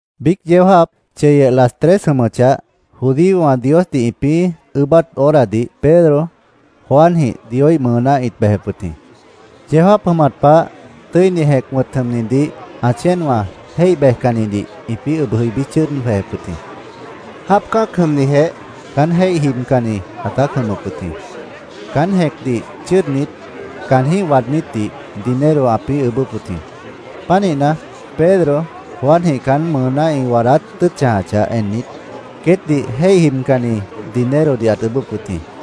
Biíc yeó jáap, cheyeh, las tres jʉmʉchah, judíowã Diosdih ĩpĩ́ ʉʉ́bát horadih Pedro, Juanjĩh Dioíh mʉʉná ĩt bejep wʉt jĩ. Yeó jáap jʉmat pah Tʉ́ini Jẽc wʉ̃t jʉmʉpdih ã chéenwã jéih bejcannidih ĩpĩ́ ʉb jʉibí chʉ́ʉd jwejep wʉt jĩ. Jáap cã́ac jʉmnijeh caán jéih jibcanni ãtát jʉmʉp wʉt jĩ. Caan jẽ́cdih chʉ́ʉdnit, caanjĩ́h waadnítdih dinero ãpĩ́ ʉʉ́bʉ́p wʉt jĩ. Pánihna, Pedro, Juanjĩh caán mʉʉná ĩ waadát tʉ́ʉt chãjachah ennit, queétdih jéih jibcanni dinerodih ãt ʉʉ́bʉ́p wʉt jĩ.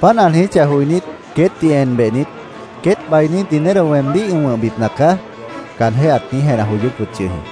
Páant ã niijíchah joinít, queétdih en behnit, “Queét bainí dinero weemdíh ĩ wʉ̃hbipna caá”, caanjéh ãt niíj jenah joyóp wʉt yʉh jĩ.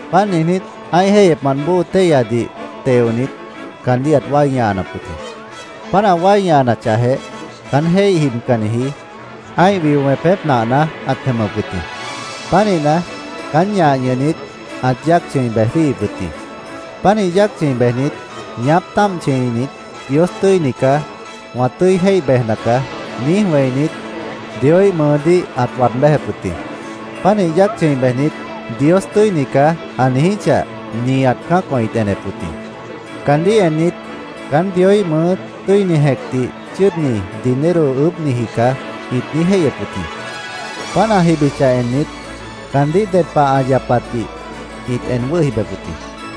Páant niijnít, ã́ih jéihyepmant bóo téihyadih teonit, caandíh ãt wái ñahanap wʉt jĩ. Páant ã wái ñahanachahjeh, caán jéih jibcanniji ã́ih wio wẽpép nahna ãt jʉmʉp wʉt jĩ. Pánihna, caán ñah ñʉhnit, ãt yáac chʉ̃i bej jwíihip wʉt jĩ. Pánih yáac chʉ̃i bejnit, ñaáp táamp chʉ̃init, “Dios tʉ́ini caá. Wã tʉ́i jéih bejna caá”, niíj wẽinit, Dioíh mʉʉdíh ãt waad béjep wʉt jĩ. Pánih yáac chʉ̃i bejnit, “Dios tʉ́ini caá”, ã niijíchah, nihat cã́acwã ĩt enep wʉt jĩ. Caandíh ennit, “Caán Dioíh mʉʉ́ Tʉ́ini Jẽcdih chʉ́ʉdni dinero ʉʉ́bhniji caá”, ĩt niíj jéihyep wʉt jĩ. Páant ã jibichah ennit, caandíh ded pah ã yapatdih ĩt en wʉ́hi bejep wʉt jĩ.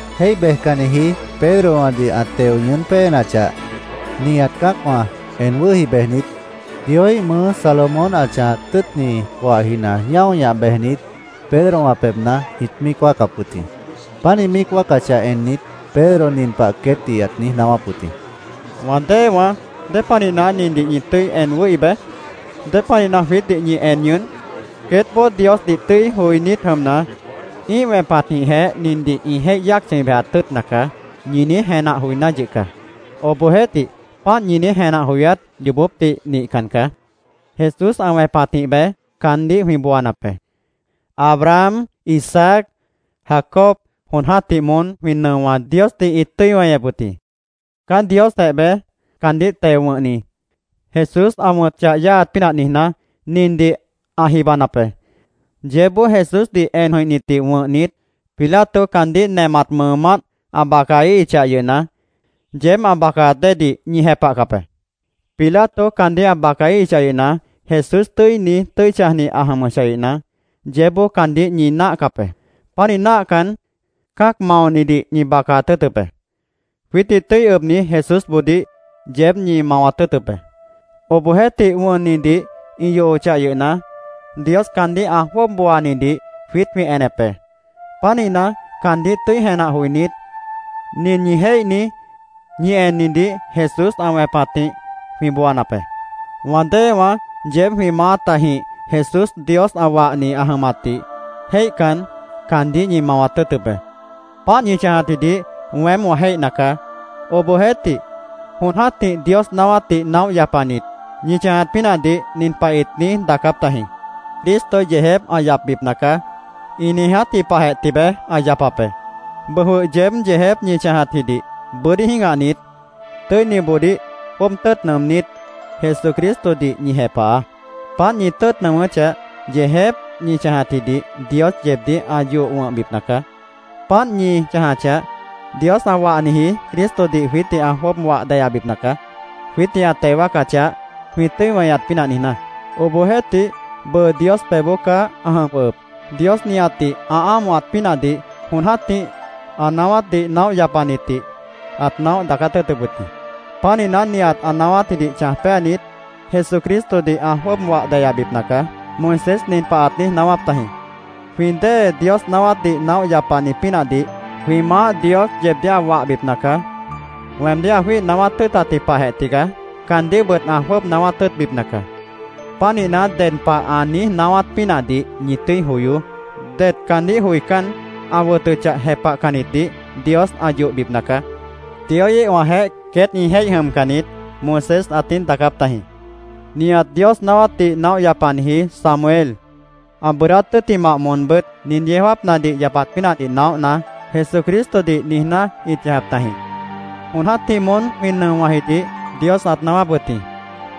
Jéih bejcanniji Pedrowãdih ã teo ñʉʉ́n péenachah, nihat cã́acwã en wʉ́hi bejnit, Dioíh mʉʉ́ Salomón ã chãjat tʉ́ʉtni coahjina ñáo ñah bejnit, Pedrowã pebhna ĩt míic wáacap wʉt jĩ. Páant ĩ míic wáacachah ennit, Pedro nin pah queétdih ãt niíj naáwáp wʉt jĩ. “¿Wã déewãá, dépanihna nindih ñi en wʉ́hi bej? ¿Dépanihna jwiítdih ñi en ñʉʉ́n? ‘Queétboó Diosdih tʉ́i joinít jʉmna, ĩ́ih wẽpatjĩhjeh nindih ĩ jéih yáac chʉ̃i bejat tʉ́ʉtna caá’, ñi niíj jenah joiná yʉh caá. Obohjeéhtih, páant ñi niíj jenah joyát yoobópdih nihcan caá. Jesús ã wẽpatjĩh beé caandíh jwĩ booanap be. Abraham, Isaac, Jacob jon jã́tih moón jwĩ nʉowã Diosdih ĩt tʉ́i weñep wʉt jĩ. Caán Diosjeh beé, caandíh teo wʉ̃hni Jesús ã wʉ̃t chah yáaat pínah niijná, nindih ã jibanap be. Yeébboó Jesúsdih en jʉ̃ihnitdih wʉ̃hnit, Pilato caandíh nemat mʉʉmánt ã bacaíhichah yʉhna, yeéb ã bacaat déedih ñi jepahcap be. Pilato caandíh ã bacaíhichah yʉhna, Jesús tʉ́ini, tʉ́i chãjni ã jʉmʉchah yʉhna, yeébboó caandíh ñi náahcap be. Pánih náahcan, cã́ac maonidih ñi bacaat tʉ́ʉtʉp be. Jwiítdih tʉ́i ʉbni Jesúsboodíh yeéb ñi mawat tʉ́ʉtʉp be. Obohjeéhtih, wʉnnidih ĩ yohochah yʉhna, Dios caandíh ã jwʉ́ʉb booanidih jwiít jwĩ enep be. Pánihna, caandíh tʉ́i jenah joinít, nin ñi jéihni, ñi ennidih Jesús ã wẽpatjĩh jwĩ booanap be. “Wã déewãá, yeéb jwĩ maátajĩh Jesús Dios ã wahni ã jʉmatdih jéihcan, caandíh ñi mawat tʉ́ʉtʉp be. Páant ñi chãjatjidih weém wã jéihna caá. Obohjeéhtih, jon jã́tih Dios naáwátdih naóh yapanit, ñi chãjat pínahdih nin pah ĩt niíj daacáp tajĩ: ‘Cristo yeejép ã yapbipna caá’, ĩ niijátji pahjeh tibeé ã yapap be. Bʉʉ jwʉh yeéb yeejép ñi chãjatjidih bʉ́dí jĩ́gahnit, tʉ́iniboodíh jwʉ́ʉb tʉ́ʉt nʉʉmnít, Jesucristodih ñi jepahaá. Páant ñi tʉ́ʉt nʉʉmʉ́chah, yeejép ñi chãjatjidih Dios yeebdíh ã yoh wʉ̃hbipna caá. Páant ñi chãjachah, Dios ã wahniji Cristodih jwiítdih ã jwʉ́ʉb wah deyabipna caá, jwiítdih ã teo wáacachah, jwĩ tʉ́i weñat pínah niijná. Obohjeéhtih, bʉʉ Dios pebhboó caá ã jʉm jwʉhʉp. Dios nihatdih ã ámohat pínahdih jon jã́tih ã naáwátdih naóh yapanitdih ãt naóh daacát tʉ́ʉtʉp wʉt jĩ. Pánihna, nihat ã naáwátjidih chãj péanit, Jesucristodih ã jwʉ́ʉb wah deyabipna caá. Moisés nin pah ãt niíj naáwáp tajĩ: ‘Jwĩ dée Dios naáwátdih naóh yapani pínahdih jwĩ Maáh Dios yeebdíh ã wahbipna caá. Weemdíh ã jwíih naáwát tʉ́ʉtatji pahjeh tigaá caandíhbʉt ã jwʉ́ʉb naáwát tʉ́ʉtbipna caá. Pánihna, ded pah ã niíj naáwát pínahdih ñi tʉ́i joyoó. Det caandíh joicán, ã wʉtʉchah jepahcannitdih Dios ã yohbipna caá. Dioíhwãjeéh queét ĩ jéih jʉmcan niít’, Moisés ãt niíj daacáp tajĩ. “Nihat Dios naáwátdih naóh yapanitji Samuel, ã bʉʉdát tʉ́ttimah moonbʉ́t nin yeó jáapnadih yapat pínahdih naóhna, Jesucristodih niijná ĩt chãjap tajĩ. Jon jã́tih moón jwĩ nʉowãjidih Dios ãt naáwáp wʉt jĩ.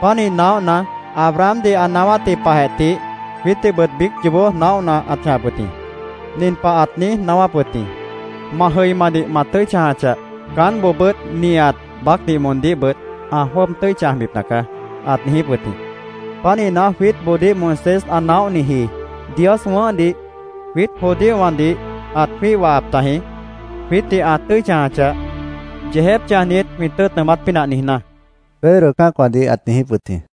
Pánih naóhna, Abrahamdih ã naáwátji pahjeh tih jwiítdihbʉt biíc yoobó naóhna ãt chãjap wʉt jĩ. Nin pah ãt niíj naáwáp wʉt jĩ: ‘Ma jʉimadih wã tʉ́i chãjachah, caánboobʉ́t nihat baácdih moondíhbʉt ã jwʉ́ʉb tʉ́i chãjbipna caá’, ãt niijíp wʉt jĩ. Pánihna, jwiítboodíh Moisés ã naóhniji Dios wʉ̃ʉ́hdih jwiít judíowãdih ãt jwíih wahap tajĩ, jwiítdih ã tʉ́i chãjachah, yeejép chãjnit jwĩ tʉ́ʉt nʉʉmát pínah niijná”, Pedro cã́acwãdih ãt niijíp wʉt jĩ.